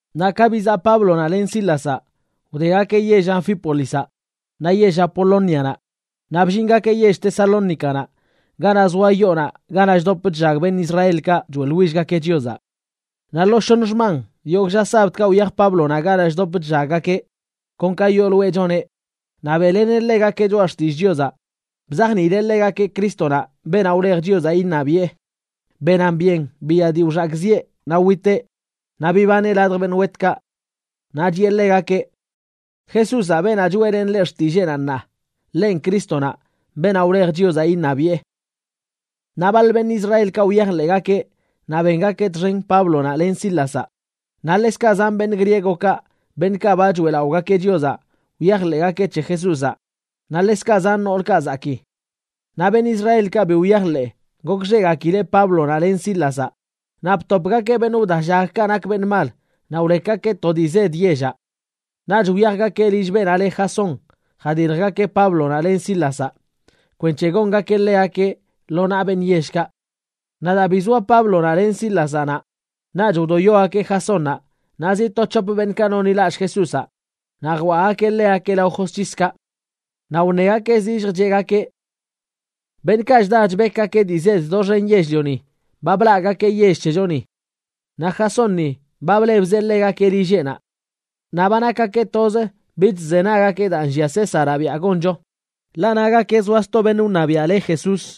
Naꞌ ka bizaꞌ Páblonaꞌ len Sílazaꞌ, wdegakeꞌ yell Anfípolizaꞌ naꞌ yell Apolónianaꞌ, naꞌ bllingakeꞌ yell Tesalónicanaꞌ ganaꞌ zoa yoonaꞌ ganaꞌ chdop chllag beṉꞌ Israelkaꞌ choeꞌḻwillgakeꞌ Chiozaꞌ. Naꞌ lo shoṉ xman yogꞌ lla sabdkaꞌ wyaj Páblonaꞌ ganaꞌ chdop chllaggakeꞌ, kon ka yooloeꞌ choneꞌ, naꞌ beꞌleneꞌ ḻegakeꞌ Choꞌa Xtillꞌ Chiozaꞌ, bzajniileꞌ ḻegakeꞌ Crístonaꞌ, beenaꞌ wlej Chiozaꞌ iṉabiꞌe, benan byen biya dii wxakꞌziꞌe naꞌ witeꞌ, naꞌ bibaneꞌ ladj beṉꞌ wetkaꞌ. Naꞌ chiꞌe ḻegakeꞌ: ―Jesúzaꞌ, beenaꞌ choeꞌlenꞌ leꞌ xtilleenaꞌ ṉaa, ḻenꞌ Crístonaꞌ, beenaꞌ wlej Chiozaꞌ iṉabiꞌe. Naꞌ baḻ beṉꞌ Israelkaꞌ wyajḻeꞌgakeꞌ naꞌ bengakeꞌ txen Páblonaꞌ len Sílazaꞌ, naꞌ ḻekzkaꞌ zan beṉꞌ griegokaꞌ, beṉꞌkaꞌ ba choeꞌlaꞌogakeꞌ Chiozaꞌ, wyajḻeꞌgakeꞌ c̱he Jesúzaꞌ, naꞌ ḻekzkaꞌ zan noolkaꞌ zakii. Naꞌ beṉꞌ Israelkaꞌ bi wyajḻeꞌ, gokxeꞌgakileꞌ Páblonaꞌ len Sílazaꞌ, naꞌ btopgakeꞌ beṉꞌ wdallagkaꞌ nak beṉꞌ mal, naꞌ wlekgakeꞌ to dii zed yellaꞌ. Naꞌch wyajgakeꞌ lill beenaꞌ le Jasón jadiljgakeꞌ Páblonaꞌ len Sílazaꞌ kwenc̱he gongakeꞌ ḻegakeꞌ lo naꞌ beṉꞌ yellkaꞌ. Naꞌ daa bi zoa Páblonaꞌ len Sílazaꞌ naꞌ, naꞌch wdoyogakeꞌ Jasónnaꞌ naꞌ zi to c̱hop beṉꞌkaꞌ nonḻilallꞌ Jesúzaꞌ naꞌ jwaꞌgakeꞌ ḻegakeꞌ lao josc̱hiskaꞌ. Naꞌ wṉegakeꞌ zillj cheꞌgakeꞌ: ―Beṉꞌkaꞌ chda chbekgakeꞌ dii zed doxen yell-lioni ba blaꞌgakeꞌ yell c̱hechoni. Naꞌ Jasónni ba blebzeꞌ ḻegakeꞌ lilleꞌnaꞌ. Naꞌ ba nakgakeꞌ toz bich chzenaggakeꞌ daa nllia Césaraꞌ biaꞌ goncho, ḻaꞌ nagakeꞌ zoa sto beṉꞌ wṉabiaꞌ le Jesús.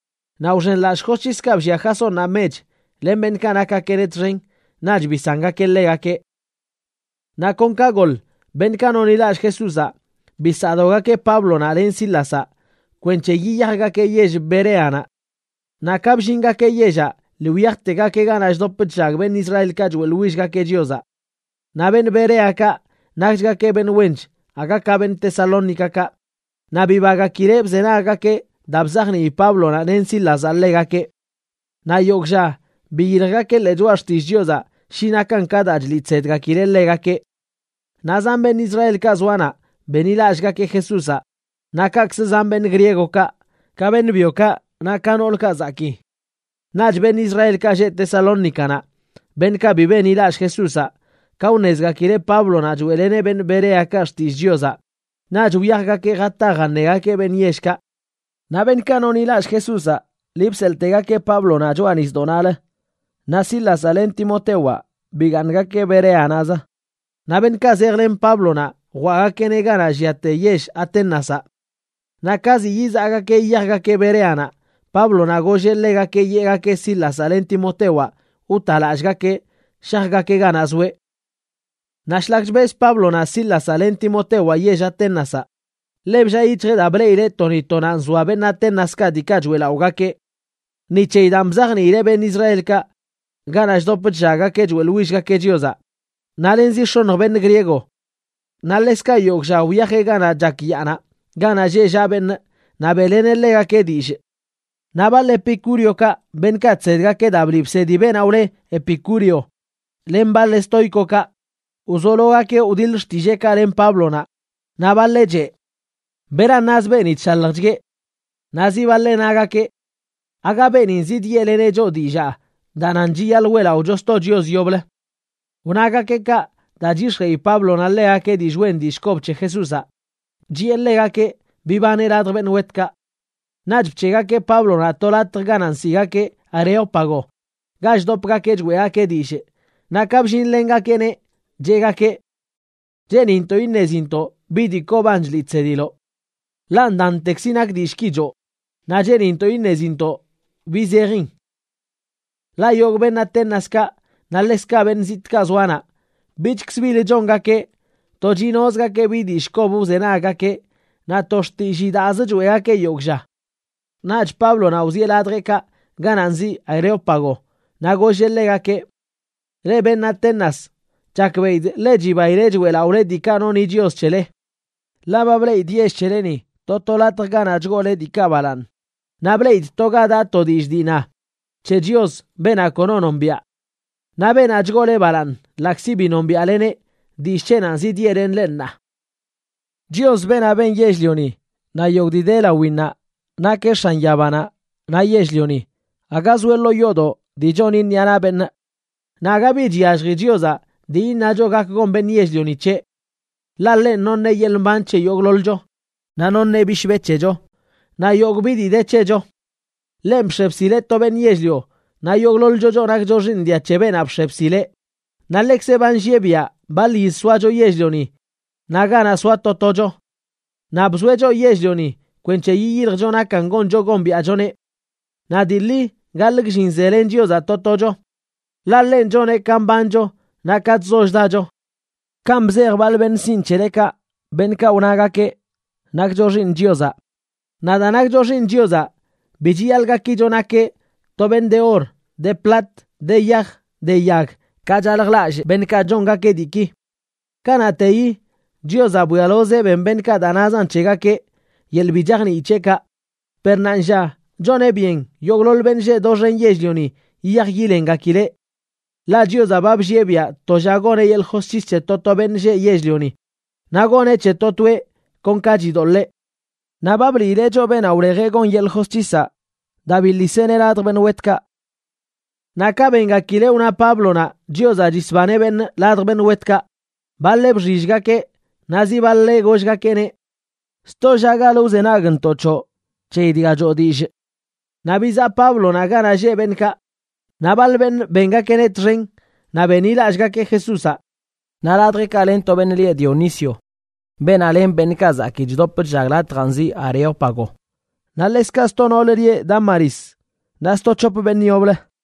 Naꞌ wxenlallꞌ josc̱hiskaꞌ bllia Jasónnaꞌ mech len beṉꞌkaꞌ nakgakeꞌneꞌ txen, naꞌch bisangakeꞌ ḻegakeꞌ. Naꞌ kon ka goḻ, beṉꞌkaꞌ nonḻilallꞌ Jesúzaꞌ bisaꞌdogakeꞌ Páblonaꞌ len Sílazaꞌ kwenc̱he yiyajgakeꞌ yell Bereanaꞌ. Naꞌ ka bllingakeꞌ yellaꞌ, lii wyajtegakeꞌ ganaꞌ chdop chllag beṉꞌ Israelkaꞌ choeꞌḻwillgakeꞌ Chiozaꞌ. Naꞌ beṉꞌ Bereakaꞌ nakchgakeꞌ beṉꞌ wench aga ka beṉꞌ Tesalónicakaꞌ, naꞌ bibagakileꞌ bzenaggakeꞌ daa bzajnii Páblonaꞌ len Sílazaꞌ ḻegakeꞌ. Naꞌ yogꞌ lla biyiljgakeꞌ ḻee Choꞌa Xtillꞌ Chiozaꞌ shi nakan ka daa chliꞌ chsedgakileꞌ ḻegakeꞌ. Naꞌ zan beṉꞌ Israelkaꞌ zoa naꞌ benḻilallꞌgakeꞌ Jesúzaꞌ naꞌ kaꞌkzə zan beṉꞌ griegokaꞌ, ka beṉꞌ byokaꞌ naꞌ ka noolkaꞌ zakii. Naꞌch beṉꞌ Israelkaꞌ lleꞌ Tesalónicanaꞌ, beṉꞌkaꞌ bi benḻilallꞌ Jesúzaꞌ, ka wṉezgakileꞌ Páblonaꞌ choeꞌleneꞌ beṉꞌ Bereakaꞌ xtillꞌ Chiozaꞌ, naꞌch wyajgakeꞌ jata jaṉegakeꞌ beṉꞌ yellkaꞌ. Naꞌ beṉꞌkaꞌ nonḻilallꞌ Jesúzaꞌ lii bseḻꞌtegakeꞌ Páblonaꞌ choꞌa nisdoꞌnaꞌlə, naꞌ Sílazaꞌ len Timotewaꞌ bigaaṉgakeꞌ Bereanaꞌzə. Naꞌ beṉꞌkaꞌ zejlen Páblonaꞌ jwaꞌgakeꞌneꞌ ganaꞌ lliate yell Aténazaꞌ. Naꞌ ka zi yizaꞌgakeꞌ yiyajgakeꞌ Bereanaꞌ, Páblonaꞌ golleꞌ ḻegakeꞌ yeꞌgakeꞌ Sílazaꞌ len Timotewaꞌ wtalallꞌgakeꞌ shajgakeꞌ ganaꞌ zoeꞌ. Naꞌ shlak chbez Páblonaꞌ Sílazaꞌ len Timotewaꞌ yell Aténazaꞌ, ḻe bllaa yic̱hjeꞌ daa bleꞌileꞌ to ni to naꞌ nzoa beṉꞌ Aténaskaꞌ diikaꞌ choeꞌlaꞌogakeꞌ. Ni c̱heyi daan bzajniileꞌ beṉꞌ Israelkaꞌ ganaꞌ chdop chllaggakeꞌ choeꞌḻwillgakeꞌ Chiozaꞌ, naꞌ len zi x̱oṉj beṉꞌ griego. Naꞌ ḻekzkaꞌ yogꞌ lla wyajeꞌ ganaꞌ chak yaanaꞌ ganaꞌ lleꞌ llaꞌ beṉꞌ naꞌ beꞌleneꞌ ḻegakeꞌ dillꞌ. Naꞌ baḻ epicúreokaꞌ, beṉꞌkaꞌ chsedgakeꞌ daa bliꞌ bsedi beenaꞌ wle Epicúreo, len baḻ estóicokaꞌ, wzologakeꞌ wdiḻ xtilleekaꞌ len Páblonaꞌ. Naꞌ baḻeꞌ cheꞌ: ―¿Beran naz beeni chshaljchgueꞌ? Naꞌ zi baḻeꞌ nagakeꞌ: ―¿Aaga beenin zidyeꞌleneꞌ choꞌ dillaa daa nan chiyaḻꞌ weꞌlaꞌocho sto chios yoblə? Wnagakeꞌ kaꞌ daa chyix̱jeꞌi Páblonaꞌ ḻegakeꞌ dillꞌ wen dillꞌ kob c̱he Jesúzaꞌ, chiꞌe ḻegakeꞌ bibaneꞌ ladj beṉꞌ wetkaꞌ. Naꞌch bc̱heꞌgakeꞌ Páblonaꞌ to latj ganaꞌ nsiꞌgakeꞌ Areópago ga chdopgakeꞌ choeꞌgakeꞌ dillꞌ, naꞌ ka bllinlengakeꞌneꞌ, cheꞌgakeꞌ: ―Cheenintoꞌ iṉezintoꞌ bi dii koban chliꞌ chsediloꞌ. Ḻaꞌ ndantekzi nak dillꞌki choo, naꞌ cheenintoꞌ iṉezintoꞌ bi zejin. Ḻaꞌ yogꞌ beṉꞌ Aténaskaꞌ naꞌ ḻekzkaꞌ beṉꞌ zitꞌkaꞌ zoa naꞌ, bichkzə bilə chongakeꞌ, to chinozgakeꞌ bi dillꞌ kob wzenaggakeꞌ naꞌ to xtillii daazə choeꞌgakeꞌ yogꞌ lla. Naꞌch Páblonaꞌ wzieꞌ ladjeꞌkaꞌ ganaꞌ nziꞌ Areópago, naꞌ golleꞌ ḻegakeꞌ: ―Leꞌ beṉꞌ Atenas, chakbeꞌidꞌ ḻe chibaile choeꞌlaꞌole diikaꞌ noni chios c̱hele. Ḻaꞌ ba bleꞌidꞌ yell c̱heleni to to latj ganaꞌ chgoole diikaꞌ balaaṉ, naꞌ bleꞌidꞌ to ga daꞌ to dillꞌ dii na: “C̱he Chios, beenaꞌ kono nombiaꞌ.” Naꞌ beenaꞌ chgoole balaaṉ ḻaꞌkzi bi nombiaꞌleneꞌ, dillꞌ c̱heꞌnanꞌ zidyeꞌlenꞌ leꞌ ṉaa. ’Chios, beenaꞌ ben yell-lioni naꞌ yogꞌ dii de lawinnaꞌ nakeꞌ X̱an yabanaꞌ naꞌ yell-lioni. Aga zoeꞌ ḻoo yoodoꞌ dii choni ṉiꞌa naꞌ beṉꞌ. Naꞌ aga bi chyallji Chiozaꞌ dii iṉacho gak gon beṉꞌ yell-lionaꞌ c̱heꞌ. Ḻaꞌ ḻenꞌ noṉeꞌ yeḻꞌ mban c̱he yogꞌḻoḻcho, naꞌ noṉeꞌ bishbe c̱hecho, naꞌ yogꞌ bi dii de c̱hecho. ’Ḻenꞌ bx̱e bsileꞌ to beṉꞌ yell-lio, naꞌ yogꞌḻoḻcho choꞌ nakcho xiiṉ dia c̱he beenaꞌ bx̱e bsileꞌ, naꞌ ḻeꞌkzeꞌ ba nllieꞌ biaꞌ baḻ yiz soacho yell-lioni naꞌ ganaꞌ soa to tocho. Naꞌ bzoeꞌ choꞌ yell-lioni kwenc̱he yiyiljcho nakan goncho gombiaꞌchoneꞌ. Naꞌ dii ḻi gaḻꞌ gllin zelen Chiozaꞌ to tocho, ḻaꞌ ḻenꞌ choneꞌ ka mbancho naꞌ ka chzo chdacho. Kanꞌ bzej baḻ beṉꞌ sinꞌ c̱helekaꞌ, beṉꞌkaꞌ wnagakeꞌ: “Nakcho xiiṉ Chiozaꞌ.” Naꞌ daa nakcho xiiṉ Chiozaꞌ, bi chiyaḻꞌ gakicho nakeꞌ to beṉꞌ de or, de plat, de yaj, de yag, ka chaljlallꞌ beṉꞌkaꞌ chongakeꞌ diiki. Kanaꞌteyi Chiozaꞌ bwialozeꞌ ben beṉꞌkaꞌ daa nazan c̱hegakeꞌ yeḻꞌ bi chajnii c̱heꞌkaꞌ, per ṉaanlla choneꞌ byen yogꞌḻoḻ beṉꞌ lleꞌ doxen yell-lioni yiyaj yilengakileꞌ. Ḻaꞌ Chiozaꞌ ba bllieꞌ biaꞌ to lla goneꞌ yeḻꞌ josc̱his c̱he to to beṉꞌ lleꞌ yell-lioni, naꞌ goneꞌ c̱he to toeꞌ kon ka chidoḻee. Naꞌ ba bliileꞌ choꞌ beenaꞌ wlejeꞌ gon yeḻꞌ josc̱hisaꞌ daa biḻiseꞌneꞌ ladj beṉꞌ wetkaꞌ. Naꞌ ka bengakileꞌ wna Páblonaꞌ Chiozaꞌ chisbaneꞌ beṉꞌ ladj beṉꞌ wetkaꞌ, baḻeꞌ bxillgakeꞌ, naꞌ zi baḻeꞌ gollgakeꞌneꞌ: ―Sto llagalə wzenagntoꞌ c̱hoꞌ c̱heyi dga choo dillꞌ. Naꞌ bizaꞌ Páblonaꞌ ganaꞌ lleꞌ beṉꞌkaꞌ. Naꞌ baḻ beṉꞌ bengakeꞌneꞌ txen naꞌ benḻilallꞌgakeꞌ Jesúzaꞌ. Naꞌ ladjeꞌkaꞌ len to beṉꞌ lieꞌ Dionisio, beenaꞌ len beṉꞌkaꞌ zakii chdop latjaꞌ nziꞌ Areópago, naꞌ ḻekzkaꞌ sto noolə lieꞌ Dámaris, naꞌ sto c̱hop beṉꞌ yoblə.